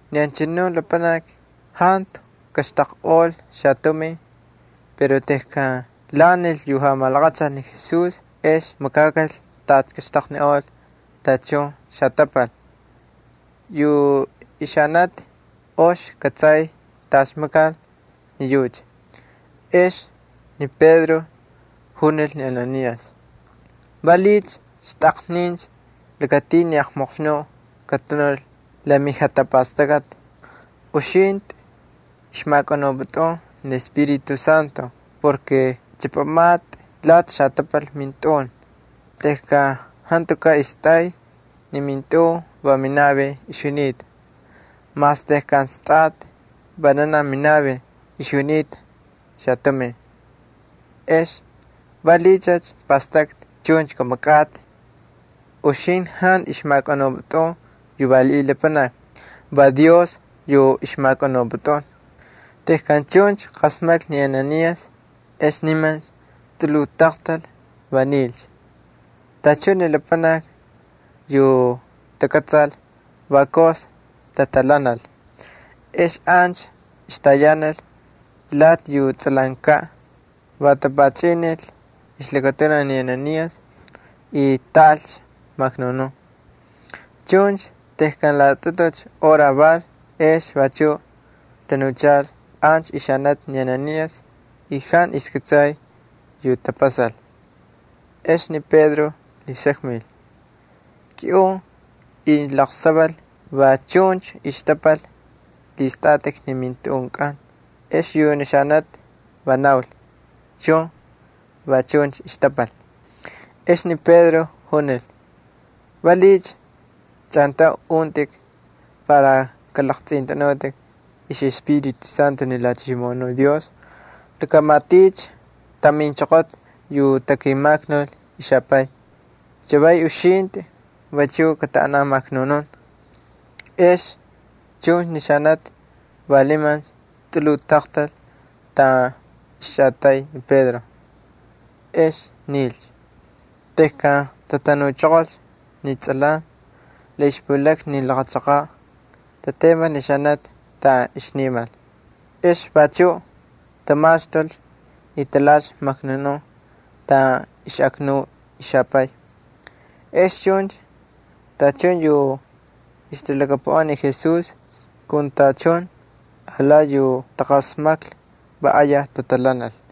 Ni anchanu lapanaki jantu kaxtaqꞌol xatumin, pero tejkan lhaꞌanil yu jamalaqachal ni Jesús ex makakal tacha kaxtaqniꞌol tachun xatapal. Yu ixanati ox ixkꞌatsay tacha makal ni yucha. Ex ni Pedro junil ni Ananías: —¿Valiꞌiycha xtꞌaqnincha lakatin ni Satanás katanul la mijatapastakꞌati? Uxintꞌi ixmakꞌanupꞌutꞌun ni Espíritu Santo porke chꞌapamatꞌi lati xatapal mintꞌun. Tejkan jantukaꞌ istꞌay ni mintꞌun va minavin ixjunita. Mas tejkan stꞌatꞌicha vananaj minavin ixjunita xatumin. ¿Ex valiꞌiycha pꞌastꞌaktꞌi chuncha kamakꞌatꞌi? Uxintꞌi jantu ixjamakꞌanupꞌutꞌun yu valiꞌiy lapanakni, va Dios yu ixmakꞌanupꞌutꞌun. Tejkan chuncha qasmaklhi ni Ananías ex nimancha tꞌuluj taqtalcha, va nilcha. Tachun ni lapanakni yu takꞌatsal va ayaj tatalhanal. Ex ancha ixtayanal lati yu tsꞌalankaꞌ, va tapachꞌinil ixlakatunaj ni Ananías y taꞌalcha maknunun. Chuncha tejkan laꞌatꞌutu hora val ex vachuꞌ tanuchal ancha ixanati ni Ananías y jantu ixkꞌatsay yu tapasal. Ex ni Pedro lhisakmil: —Kiꞌun incha laqsaval va chuncha xtapal lhistꞌatꞌik ni mintꞌunkꞌan. Ex yu xanati va naul: —Chun, va chuncha xtapal. Ex ni Pedro junil: —¿Valiꞌiycha chꞌantauncha untꞌik para kalaqtsꞌintꞌanutꞌik IxꞌEspíritu Santo ni Jalhachimoꞌonuꞌ Dios? Laka matiꞌicha taminchoqota yu takimaknul mixapay. Chavaycha uxintꞌi vachuꞌ kataꞌanan maknunun. Ex chuncha ni xanati va nimancha tꞌuluj taqtal taꞌan ixchꞌatay ni Pedro, ex nilcha. Tejkan tatanuchoqolcha ni tsꞌalan la ixpulakna ni laqa chaqaꞌ, tatemal ni xanati taꞌan ixnimal. Ex vachuꞌ tamaxtulcha y talhaꞌalcha maknunun taꞌan ixꞌaknuy ixapay. Ex chuncha tachun yu ixtalhakapuꞌan ni Jesús kun tachun alati yu taqasmaklhi va ayaj tatalhanal.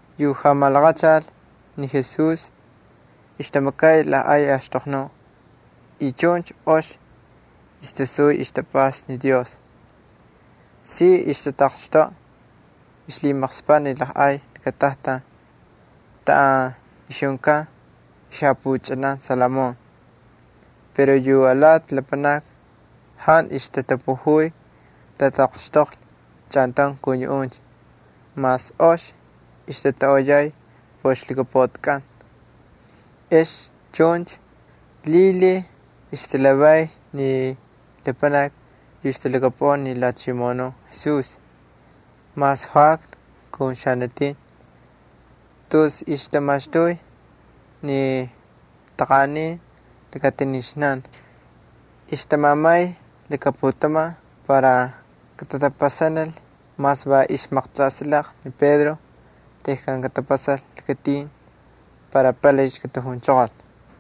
Yu jamalaqachal ni Jesús ixtamakay lajꞌay axtoqnuꞌ y chuncha ox ixtasuy ixtapꞌasta ni Dios. Si ixtataqxtoꞌa ixlhimaqspaꞌ ni ay lakatajtan taꞌan ixjunkan ixjapuchꞌanan Salomón. Pero yu alati lapanakni jantu ixtatapujuy katataqxtoqlhi chꞌantaun kun yuꞌuncha mas ox ixtatoꞌoyay por ixlhakapuꞌatikꞌan. Ex chuncha lhilhiy ixtalhavay ni lapanakni yu ixtalhakapuꞌan ni Jalhachimoꞌonuꞌ Jesús, mas joꞌakna kun xanatin. Tus ixtamaxtuy ni taqanꞌanin lakatinixnan ixtamamay laka putaman para katatapasanil mas va ixmaqtsꞌansilaqa ni Pedro tejkan katapasal lakatin para palaycha katajunchoqolcha.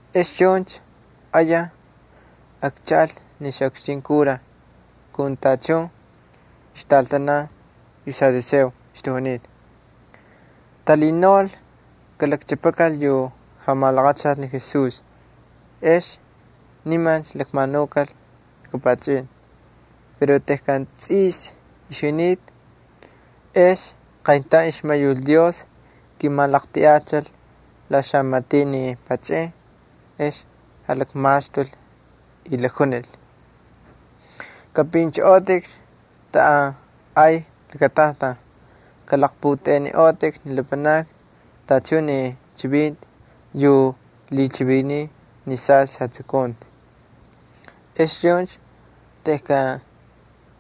Ex chuncha ayaj akchaꞌal ni xaꞌukxtin kura kun tachun ixtꞌaltanan yu saduceos ixtajunita. Talhinaul kalakchꞌapakal yu jamalaqachal ni Jesús, ex nimancha lakmanukal laka pachꞌin. Pero tejkan tsꞌis ixjunita, ex qayntaun ixmayul Dios kimalaqltiꞌachil la xamatiꞌ ni pachꞌin, ex jalakmaxtul y jalakjunil: —Kꞌapꞌinchꞌoꞌotꞌikcha taꞌan ay lakatajtan. Kalaqpꞌutꞌeꞌeniꞌotꞌik ni lapanakni tachun ni chivinti yu lhichiviniy ni sastꞌi jatsukunti. Ex chuncha tejkan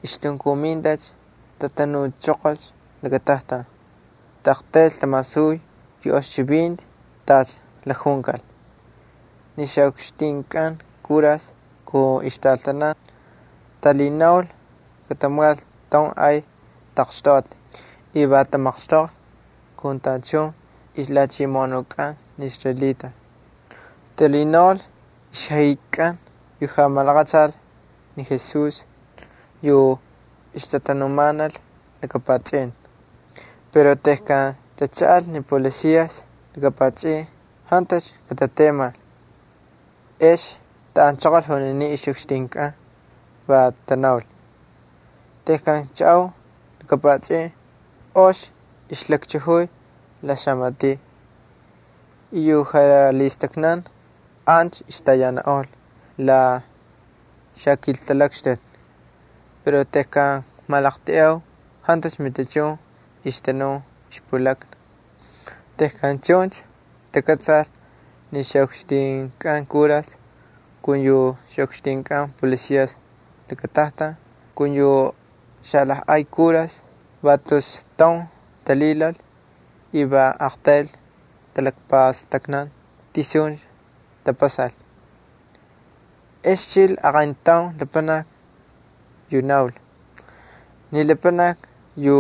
ixtunkumintacha tatanuchoqolcha lakatajtan, taꞌaqtayl tamasuy yu ox chivinti tacha jalakjunkal. Ni ixꞌukxtinkꞌan kuras kun ixtꞌaltanan talhinaul katamakal taun ay taqxtoꞌati y va tamaqxtoqlhi kun tachun ixlhachimoꞌonunkꞌan ni israelitas. Talhinaul ixjaꞌikakꞌan yu jamalaqachal ni Jesús yu ixtatanumanal laka pachꞌin. Pero tejkan tachaꞌal ni policias laka pachꞌin jantucha katatemal. Ex taꞌanchoqol juninin ixꞌukxtinkꞌan, va tanaul: —Tejkan kchaꞌau laka pachꞌin ox ixlakchajuy la xamatiꞌ. Y yu jalhistaknan ancha ixtayananꞌol la xakiltalakxtuti. Pero tejkan kmalaqltiꞌau, jantu matichun ixtanun ixpulakna. Tejkan chuncha takꞌatsal ni ixꞌukxtinkꞌan kuras kun yu ixꞌukxtinkꞌan xapolicias lakatajtan kun yu xalajꞌay kuras va tus taun talhilal y va aqtayl talakpastaknan tisuncha tapasalcha. Ex chil aqayntaun lapanaki yu naul: —Ni lapanakni yu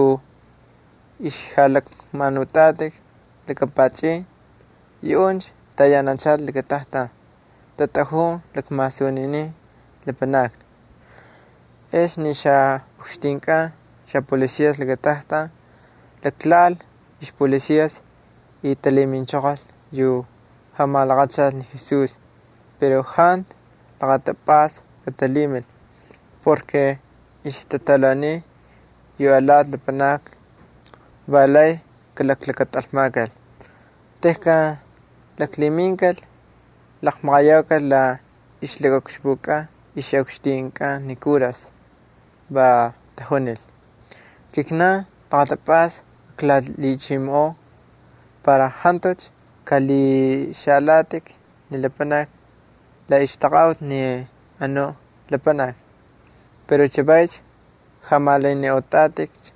ixjalakmanutꞌatꞌik laka pachꞌin, yuꞌuncha tayananchal lakatajtan, tatꞌajun lakmasuninin lapanakni. Ex ni ixꞌukxtinkꞌan xapolicias lakatajtan jalaklhaꞌal ixpolicias y talhiminchoqol yu jamalaqachal ni Jesús. Jantu laqatapꞌasta katalhimil porke ixtatalhauniy yu alati lapanakni, va lay kalaklakatꞌalmakal. Tejkan laklhiminkal, laqmaqayaukal la ixlakaꞌukxpukꞌan ixꞌukxtinkꞌan ni kuras. Va tajunil: —Kijnan laqatapꞌasta klalhichimoꞌoo para jantucha kꞌalhixaꞌalatꞌik ni lapanakni la ixtaqaꞌuti ni anu lapanaki. Pero chavaycha jamalaniꞌotꞌatꞌikcha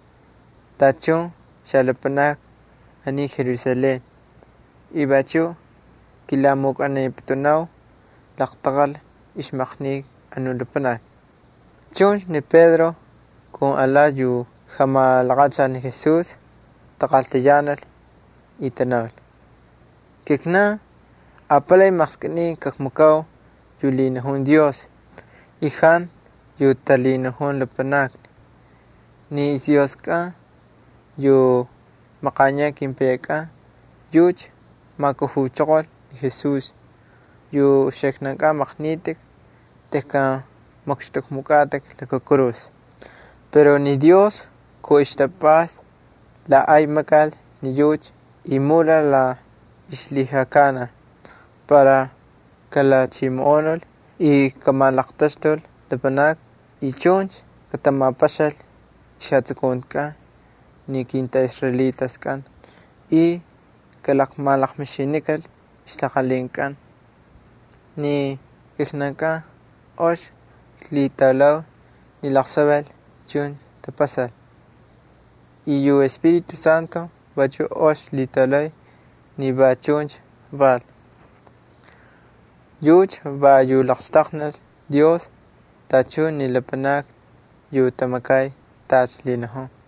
tachun xalapanakni aniy Jerusalén y vachuꞌ kilamukꞌaniputunau laqtaqal ixmaqnika anu lapanaki. Chuncha ni Pedro kun alati yu jamalaqachal ni Jesús taqaltayanal y tanaul: —Kijnan apalay maqskꞌiniy kakmakau yu lhinajun Dios y jantu yu talhinajun lapanakni. Ni ixDioskꞌan yu maqaniyaꞌ kepayankꞌan yucha majkujuchoqol ni Jesús yu uxiknankꞌan maqnitꞌik tejkan makxtꞌukmukꞌatꞌik laka kurus. Pero ni Dios kun ixtapꞌasta la ay makal y mulal la ixlhijakanaj para kalhachimoꞌonul y kamalaqtaxtul lapanakni y chuncha katamapaxal ixjatapastakꞌatkꞌan ni kintꞌaꞌisraelitaskꞌan y kalaqmalaqmixinikal ixtalaqalhinkꞌan. Ni kijnankꞌan ox klhitaulau ni laqsaval chuncha tapasal. Y yu Espíritu Santo vachuꞌ ox lhitaulay ni va chuncha val. Yucha va yu laqxtaqnil Dios tachun ni lapanakni yu tamakay tacha lhinajun.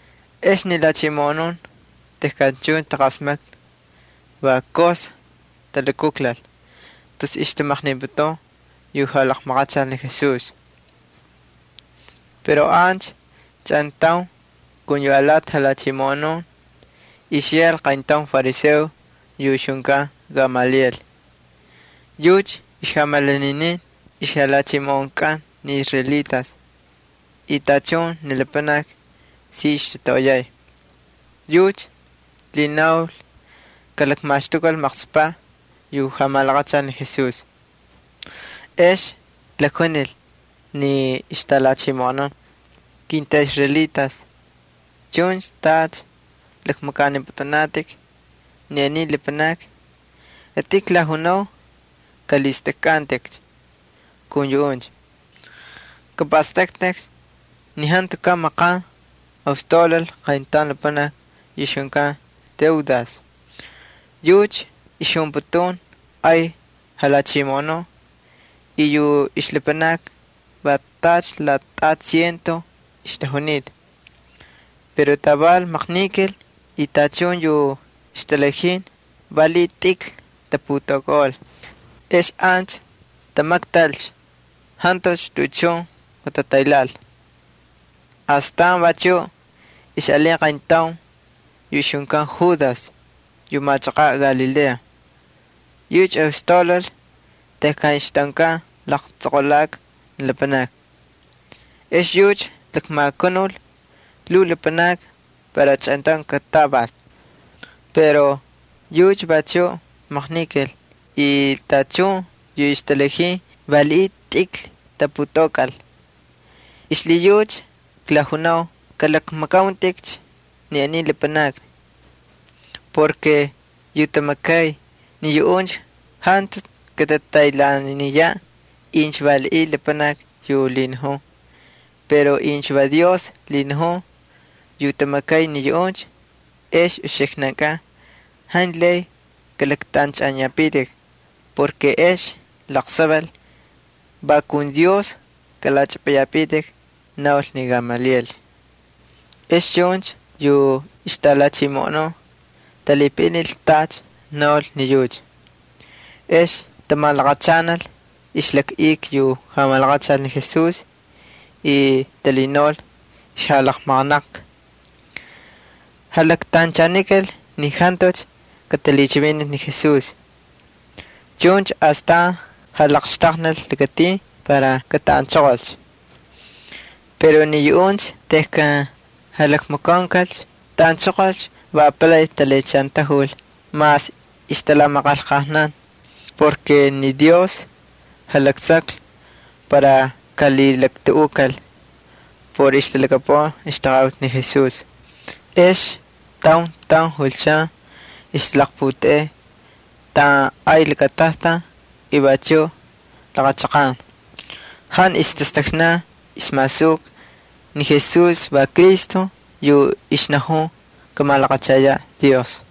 Ex ni lhachimoꞌonun tejkan chuncha taqasmaklhi va ayaj talukujlal tus ixtamaqniputun yu jamalaqachal ni Jesús. Pero ancha chꞌantaun kun yu alati jalhachimoꞌonun ixyal qayntaun fariseo yu ixjunkan Gamaliel. Yucha ixjamalaninin ixlhachimoꞌonkꞌan ni israelitas y tachun ni lapanakni si ixtatoꞌoyay. Yucha lhinaul kalakmaxtukal maqspaꞌ yu jamalaqachal ni Jesús. Ex lakjunil ni ixtꞌalhachimoꞌonun: —Kintꞌaꞌisraelitas, chuncha tacha lakmakꞌanipꞌutꞌunatꞌik ni aniy lapanakni, kitꞌin klajunau kꞌalhistꞌajkꞌantꞌikcha kun yuꞌuncha. Kapꞌastꞌaktꞌik ni jantukaꞌ maqan ostaulal qayntaun lapanaki yu ixjunkan Teudas. Yucha ixjunputun ay jalhachimoꞌonuꞌ y yu ixlapanakni va tacha laꞌatꞌati ciento ixtajunita. Pero taval maqnikal y tachun yu ixtꞌaltanan valiꞌiy tꞌikl taputaukꞌaꞌol. Ex ancha tamaktalcha, jantucha tuꞌuchun katataylhaꞌal. Astan vachuꞌ ixꞌalin qayntaun yu ixjunkan Judas yu machaqaꞌ Galilea. Yucha ostaulal tejkan ixtꞌaunkan laqtsꞌoqolaka ni lapanakni. Ex yucha lakmakanul lhuu lapanakni para chꞌantaun katatꞌaval. Pero yucha vachuꞌ maqnikal y tachun yu ixtꞌaltanan valiꞌiy tꞌikl taputaukꞌaꞌol. Xlhiyucha klajunau kꞌalakmakꞌauntꞌikcha ni aniy lapanakni. Yu tamakay ni yuꞌuncha jantu katataylhaaniyaꞌ incha valiꞌiy lapanaki yu lhinajun. Pero incha va Dios lhinajun yu tamakay ni yuꞌuncha, ex uxiknankꞌan jantu lay kꞌalaktꞌanchꞌaniyapitik porke ex laqsaval va kun Dios kꞌalachꞌapꞌayapitik —naul ni Gamaliel. Ex chuncha yu ixtꞌalhachimoꞌonun talhipaꞌinil tacha naul. Ex tamalaqachanal ixjalakꞌika yu malaqachal ni Jesús y talhinaul ixjalaqmaqanaqka. Jalaktanchanikal ni jantucha katalhichivinil ni Jesús. Chuncha astan jalaqxtaqnil lakatin para kataꞌanchoqolcha. Pero ni yuꞌuncha tejkan jalakmakaunkalcha kataꞌanchoqol va apalay talhiꞌachantajul mas ixtalamaqanlqajnan porke ni Dios jalaksaklhi para kalhilaktuꞌukal por ixtalhakapuꞌan ixtaqaꞌuti ni Jesús. Ex taun taun julchan ixtalaqputeꞌey taꞌan ay lakatajtan y vachuꞌ laqa chaqan. Jantu ixtastaknan ixmasuka ni Jesús va Cristo yu ixnajun kamalaqachayaꞌ Dios.